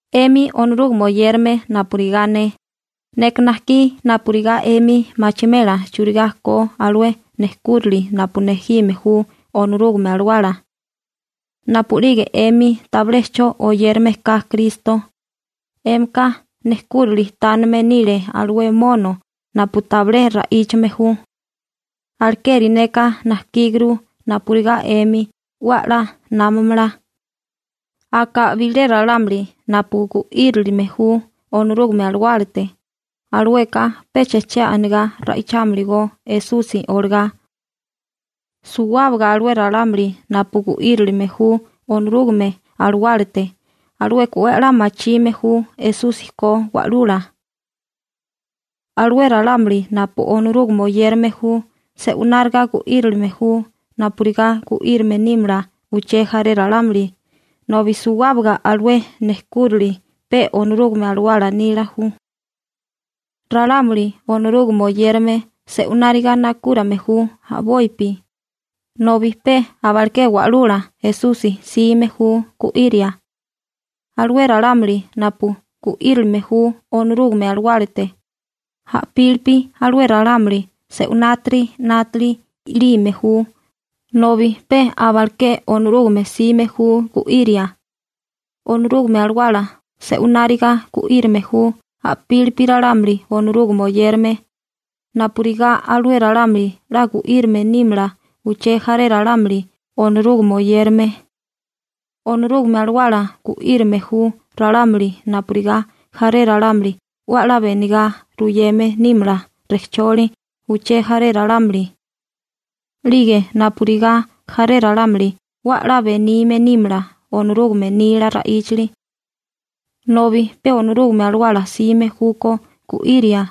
'Emi Onorúgame oyérame napurigá ne, neka najkí napurigá 'emi machimela churigá ko alué nejkúrili napu nejime ju Onorúgame Alawala. Napu'lige 'emi tabilé 'cho oyérame ka Kristo, 'émika nejkúrali tanime nile alué mono napu tabilé ra'íchame ju. Alekeri neka najkíguru napurigá 'emi 'we 'la námamala. Aka bilé ralámuli napu gu'írilime ju Onorúgame Alawálate, alueka pecha che anigá ra'ichámalagó Esusi olagá. Suwábaga alué ralámuli napu gu'írilime ju Onorúgame Alawálate, alueka 'we 'la machime ju Esusi ko Wa'lula. Alué ralámuli napu Onorúgame oyérame ju se'unáriga gu'írilime ju napurigá gu'írame nímala uché jaré ralámuli, nobi suwábaga alué nejkúrali pe Onorúgame Alawala nila ju. Ralámuli Onorúgame oyérame se'unáriga nakúrame ju a'bopi, nobi pe abaleké Wa'lula Esusi 'sime ju gu'íria. Alué ralámuli napu gu'írilime ju Onorúgame Alawálate, a'pílipi alué ralámuli se'unátiri 'nátali 'yalime ju, nobi pe abaleké Onorúgame 'sime ju gu'íria. Onorúgame Alawala se'unáriga gu'írame ju a'pílipi ralámuli Onorúgame oyérame, napurigá alué ralámuli 'la gu'írame nímala uché jaré ralámuli Onorúgame oyérame. Onorúgame Alawala gu'írame ju ralámuli napurigá jaré ralámuli 'we 'la benigá ruyeme nímala rejcholi uché jaré ralámuli 'lige napurigá jaré ralámuli 'we 'la benime nímala Onorúgame nila ra'íchali. Nobi pe Onorúgame Alawala 'sime júkó gu'iria.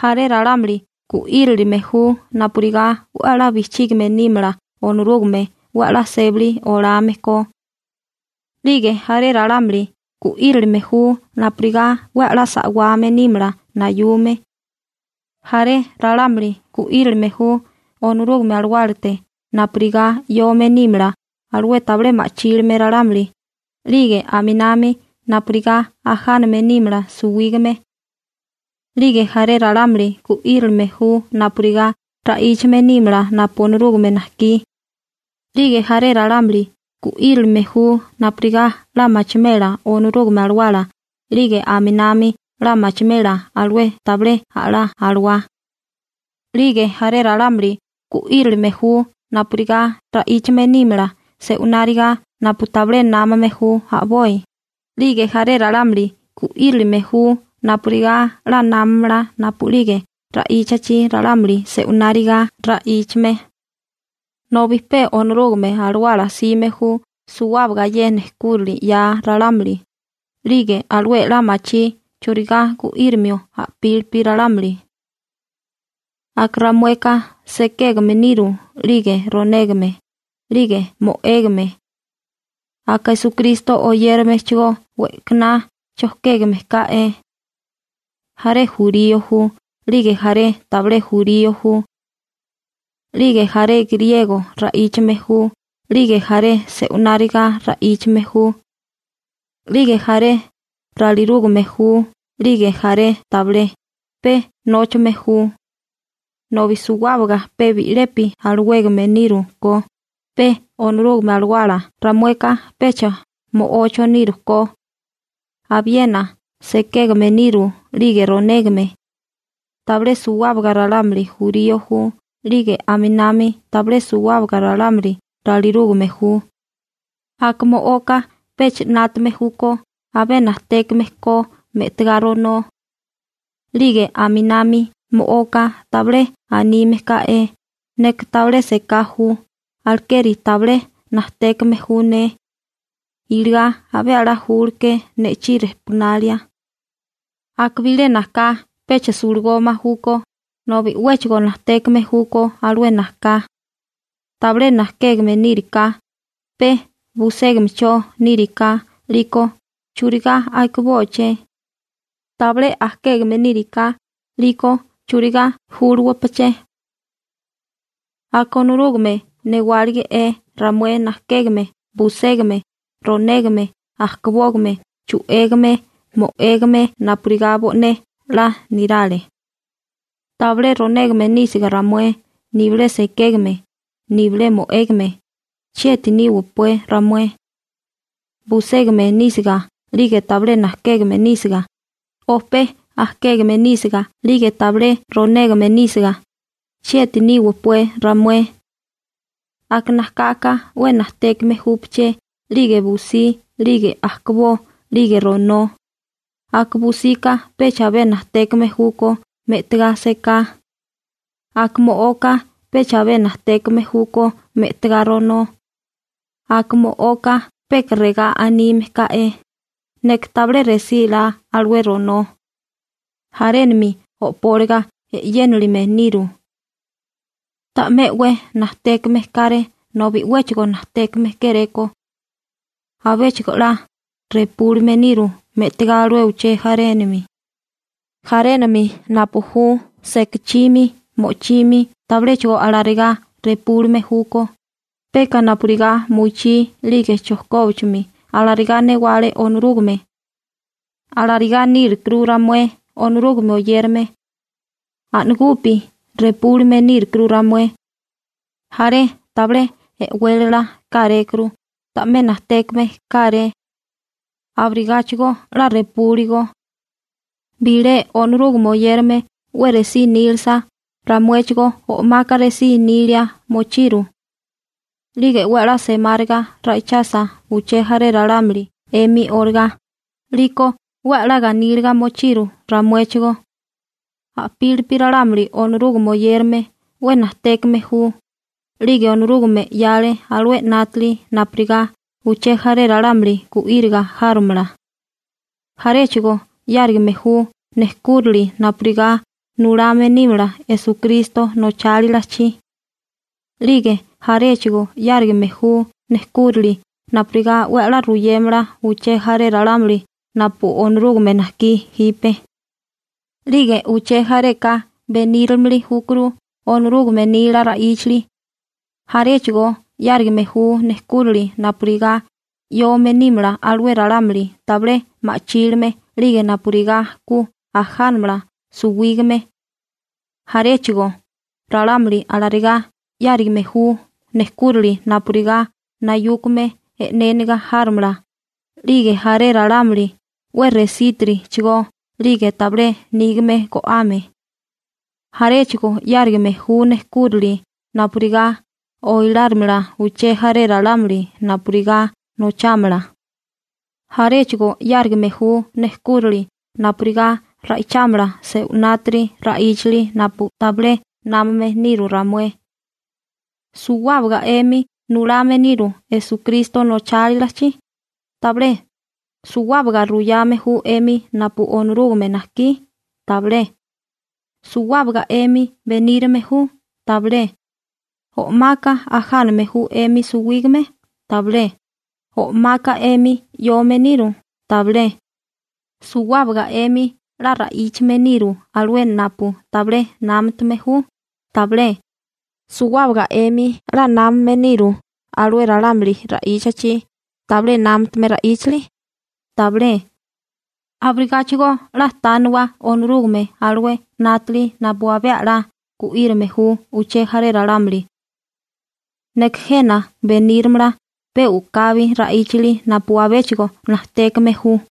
Jaré ralámuli gu'írilime ju napurigá 'we 'la bijchígame nímala Onorúgame 'we 'la sébali olame ko. 'Lige jaré ralámuli gu'írilime ju napurigá 'we 'la sa'wame nímala nayume. Jaré ralámuli gu'írilime ju Onorúgame Alawálate napurigá 'yome nímala alué tabilé ma'chílime ralámuli 'lige aminami napurigá ajáname nímala suwígame. 'Lige jaré ralámuli gu'írilime ju napurigá ra'íchame nímala napu Onorúgame najkí. 'Lige jaré ralámuli gu'írilime ju napurigá 'la machimela Onorúgame Alawala 'lige aminami 'la machimela alué tabilé a'lá alawá. 'Lige jaré ralámuli 'la gu'írilime ju napurigá ra'íchame nímala se'unáriga napu tabilé námame ju a'boi, 'lige jaré ralámuli gu'írilime ju napurigá 'la námamala napu'lige ra'íchachi ralámuli se'unáriga ra'íchame. Nobi péchigo Onorúgame Alawala 'sime ju suwábaga ye nejkúrali 'ya ralámuli, 'lige alué 'la machí churigá gu'írimio a'pílipi ralámuli. Aka ramueka sekégame niru, 'lige ronégame, 'lige mo'égame. Aka Esukristo oyéramechigó we'kaná chojkégame ká'é. Jaré jurío ju 'lige jaré tabilé jurío ju. 'Lige jaré griego ra'íchame ju 'lige jaré se'unáriga ra'íchame ju. 'Lige jaré ralirúgame ju 'lige jaré tabilé, pe nóchame ju. Nobi suwábaga pe bi'lepi alawégame niru ko, pe Onorúgame Alawala. Ramueka pecha mo'ocho niru ko. Abiena sekégame niru 'lige ronégame. Tabilé suwábaga ralámuli jurío ju 'lige aminami tabilé suwábaga ralámuli ralirúgame ju. Aka mo'oka pecha 'nátame júkó abé najtékame ko me'tigá ronó. 'Lige aminami mo'oka tabilé anime ká'é: «Neka tabilé seká ju, alekeri tabilé najtékame ju ne, iligá abé 'la júleké ne'chí rejpunalia.» Aka bilé najká pecha sulagoma júkó, nobi 'wéchigo najtékame júkó alué najká. Tabilé najkégame níriká, pe buségamecho níriká, 'liko ¿churigá akibóché? Tabilé ajkégame níriká, 'liko ¿churigá júluwapaché? Aka Onorúgame newálige'é ramué najkégame, buségame, ronégame, ajkabógame, chu'égame, mo'égame napurigá bo'né 'la nirale. Tabilé ronégame nísiga ramué, nibilé sekégame nibilé mo'égame, ¿chieti níwapué ramué? Buségame nísiga 'lige tabilé najkégame nísiga, o pe akégame nísiga 'lige tabilé ronégame nísiga, ¿chieti níwapué ramué? Aka najkaka 'we najtékame júpaché 'lige busí 'lige ajkabó 'lige ronó. Aka busika pecha abé najtékame júkó me'tigá seká. Aka mo'oka pecha abé najtékame júkó me'tigá ronó. Aka mo'oka peka regá anime ká'é: «Neka tabilé resílá alué ronó.» Jarénami o'póliga e'yénilime niru. Ta'mé 'we najtékame káré nobi 'wéchigo najtékame kéréko. Abéchigo 'la repúlime niru me'tigá alué uché jarénami. Jarénami napu ju sekachimi, mo'chimi, tabiléchigo alarigá repúlime júkó, peka napurigá muyachí 'lige chojkóbachimi. Alarigá newale Onorúgame. Alarigá nírukuru ramué Onorúgame oyérame. A'nagupi repúlime nírukuru ramué. Jaré tabilé e'wélala kárékuru, ta'mé najtékame káré. Abirigáchigo 'la repúligo. Bilé Onorúgame oyérame 'we resí nílasa, ramuéchigó o'maka resí nília mochiru. 'Lige 'we 'la semáriga ra'ichasa uché jaré ralámuli 'emi olagá, 'liko 'we 'la ganíliga mochiru ramuéchigó. A'pílipi ralámuli Onorúgame oyérame 'we najtékame ju, 'lige Onorúgame 'yale alué 'nátali napurigá uché jaré ralámuli gu'íriga járomala. Jaréchigo 'yárigame ju nejkúrali napurigá nulame nímala Esukristo nochálilachi. 'Lige jaréchigó 'yárigame ju nejkúrali napurigá 'we 'la ruyémala uché jaré ralámuli napu Onorúgame najkí jipe. 'Lige uché jareka benírimili júkuru Onorúgame nila ra'íchali. Jaréchigo 'yárigame ju nejkúrali napurigá 'yome nímala alué ralámuli tabilé ma'chílime 'lige napurigá ku ajánamala suwígame. Jaréchigo ralámuli alarigá 'yárigame ju nejkúrali napurigá nayúkame e'néniga járomala 'lige jaré ralámuli 'we resítitirichigó 'lige tabilé nígame go'ame. Jaréchigo 'yárigame ju nejkúrali napurigá oilárimala uché jaré ralámuli napurigá nochámala. Jaréchigo 'yárigame ju nejkúrali napurigá ra'ichámala se'unátiri ra'íchali napu tabilé námame niru ramué. ¿Suwábaga 'emi nulame niru Esukristo nochálilachi? Tabilé. ¿Suwábaga ruyame ju 'emi napu Onorúgame najkí? Tabilé. ¿Suwábaga 'emi benírame ju? Tabilé. ¿O'maka ajáname ju 'emi suwígame? Tabilé. ¿O'maka 'emi 'yome niru? Tabilé. ¿Suwábaga 'emi 'la ra'íchame niru alué napu tabilé námutame ju? Tabilé. ¿Suwábaga 'emi 'la námame niru alué ralámuli ra'íchachi tabilé námutame ra'íchali? Tabilé. Abirigáchigo 'la tániwagó Onorúgame alué 'nátali napu abé 'la gu'írame ju uché jaré ralámuli. Neka jena beníramala pe u'kabi ra'íchali napu abéchigo najtékame ju.